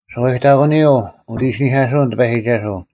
ᓱᐛᔨᑕᒂᓂᔪᐤ ᐅᑦ ᐃᓯᓂᐧᑲᓱᐅᓐ ᑎᐸᔨᒋᒐᓱᐤ,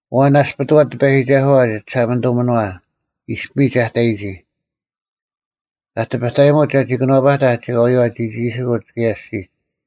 ᐊᐛᓐ ᓇᔅᐱᑐᐛᑦ ᑎᐸᔨᒋᒐᓱᐛ ᒋ ᒋᓴᒪᓂᑐᒥᓄᐛ, ᐃᔅᐱᒥᒡ ᐊ ᑕᔨᒋ; ᑲ ᑎᐱᑕᔨᒧᑦ ᒐᒋ ᑭᓄᐛᐸᑕᐧᒃ ᒐᒂᔪᐛ ᒋᒋᒋᓯᑯᒡ, ᑭᔭ ᐊᔅᒋᒡ᙮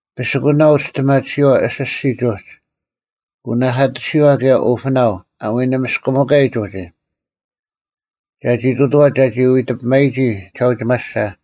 ᐱᓯᑯᓇᐤ ᐅᒋᔅᑎᒪᑎᓯᐛ ᐊᓯᔅᒋᒡ ᐅᒋ, ᐅᓇᐧᑲᑎᓯᐛ ᑭᔭ ᐅᐱᓇᐤ ᐊ ᐎᓂᒥᔅᑭᒥᑲᔨᒡ ᐅᒋ; ᒐᒋ ᑐᑐᐛᑦ ᒐᒋ ᐎᑕᐱᒪᔨᒋ ᒋᓴᐅᒋᒪᓯᓴ,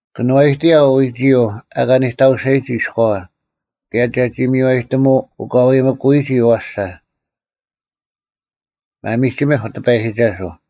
ᑭᓄᐛᔨᑎᔭᐤ ᐎᒋᔪᐤ ᐊᑲ ᓂᑕᐅᓴᔨᒋ ᐃᔎᐛ, ᑭᔭ ᒐᒋ ᒥᔽᔨᑎᒧ ᐅᑲᐎᒥᑯᔨᒋ ᐊᐛᓴ᙮ ᒪᒥᒋᒥᐧᒄ ᑎᐸᔨᒋᒐᓱᐤ!